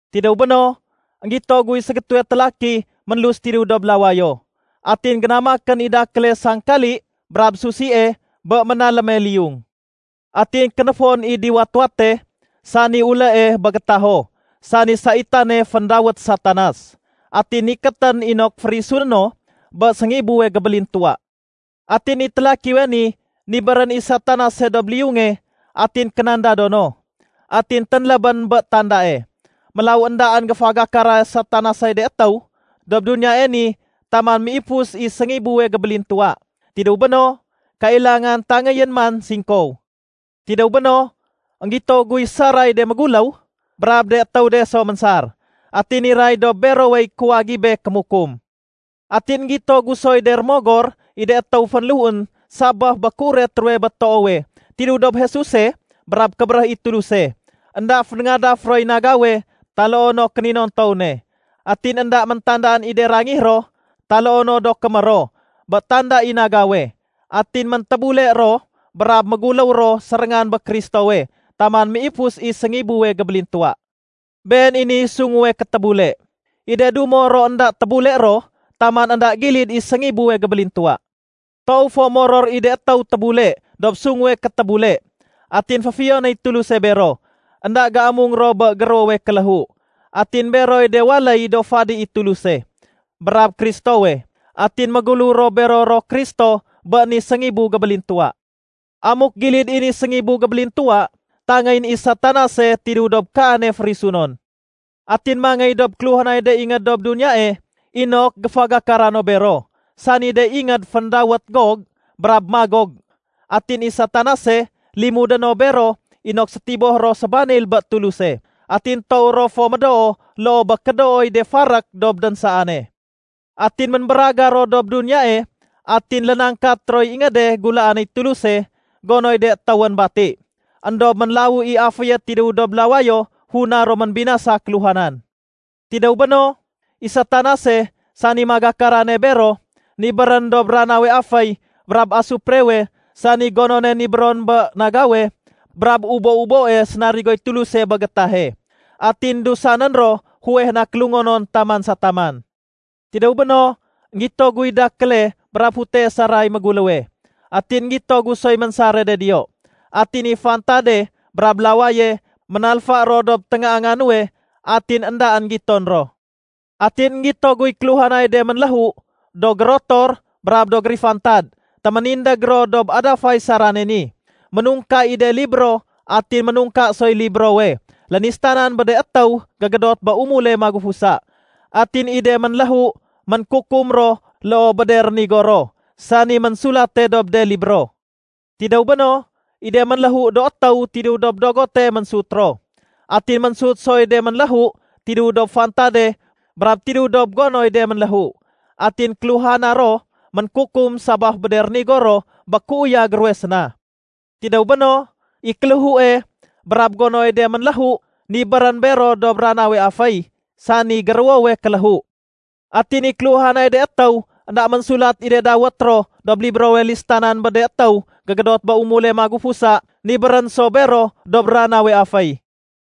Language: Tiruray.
Tidéw béno, énggito guy ségétéwe télaki ménlus tidéw dob lawayo. Atin génamakén i dakéle sangkali brab susie bé ménaléme liyung. Atin kénéfoén i diwat-wate, sani ulée bé gétaho sani saitane féndawét Satanas. Atin nikétén inok férisuné no bé séngibuwe gébélintuwa. Atin i télakiwe ni nibérén i Satanase dob liyunge atin kénandado no, atin ténlébén bé tandae. Mélaw éndaén géfagakara Satanasey de étéw dob duniyae ni taman méifus i séngibuwe gébélintuwa. Tidéw béno, kailangan tangéyén man singkow. Tidéw béno, énggito guy saray de méguléw, brab de étéw de so ménsar. Atin niray dob berowey kuwagibe kémukum. Atin énggito gu soy de rémogor i de étéw fénléhuén sabaf bé kéuret ruwe bé toowe tidéw dob Jesuse brab kébéréh i Tuluse. Enda fénéngadaf roy nagawe taloo no kéninontow ne. Atin énda méntandaan i de rangih ro taloo no do kémér ro bé tanda i nagawe. Atin méntébule ro brab méguléw ro séréngan bé Kristowe taman méifus i séngibuwe gébélintuwa. Been i niy sunguwe kétébule. I de dumo ro énda tébule ro taman énda gilid i séngibuwe gébélintuwa. Toow fo moror i de étéw tébule dob sunguwe kétébule, atin féfiyonéy Tuluse bero. Enda géamung ro bé géruwowe kéléhu. Atin beroy de waléy do fadi i Tuluse brab Kristowe. Atin méguléw ro bero ro Kristo bé ni séngibu gébélintuwa. Amuk gilid i ni séngibu gébélintuwa, tangéyén i Satanase tidéw dob kaane férisunon. Atin mangéy dob kéluhanay de ingéd dob duniyae inok géfagakara no bero, sani de ingéd féndawét Gog brab Magog. Atin i Satanase, limudé no bero inok sétiboh ro sébanil bé Tuluse. Atin toow ro fo médoo loo bé kédooy de farék dob dénsaane. Atin ménbéragar ro dob duniyae atin lénangkat roy ingéde gulaanéy Tuluse gonoy de étéwén bati. Endob ménlawu i aféye tidéw dob lawayo funa ro ménbinasa kéluhanan. Tidéw béno, i Satanase, sani magakarane bero, nibérén dob ranawe aféy brab asuprewe sani gonone nibéron bé nagawe brab ubo-uboe sénarigoy Tuluse bé gétahe. Atin dusanén ro fuweh na kélungonon taman sa taman. Tidéw béno, énggito guy dakéle brab futee saray méguléwe. Atin énggito gu soy ménsare de diyo. Atin i fantade brab lawaye ménalfa ro dob téngaanga nuwe atin éndaén giton ro. Atin énggito guy kéluhanay de ménléhu, do gérotor brab do gérifantad. Téménindég ro dob adafay sarane ni. Ménungka i de libro atin ménungka soy librowe lénistanan bé de étéw gégédot bé umule magufusa. Atin i de ménléhu ménkukum ro loo bé de rénigo ro, sani ménsulate dob de libro. Tidéw béno, i de ménléhu do étéw tidéw dob dogote ménsut ro, atin ménsut soy de ménléhu tidéw dob fantade brab tidéw dob gonoy de ménléhu. Atin kéluhana ro ménkukum sabaf bé de rénigo ro bé kéuyag ruwe séna. Tidéw béno, i kéléhue brab gonoy de ménléhu, nibérén bero dob ranawe aféy, sani géruwowe kéléhu. Atin i kéluhanay de étéw énda ménsulat i de dawét ro dob librowe listanan bé de étéw gégédot bé umule magufusa nibérén so bero dob ranawe aféy.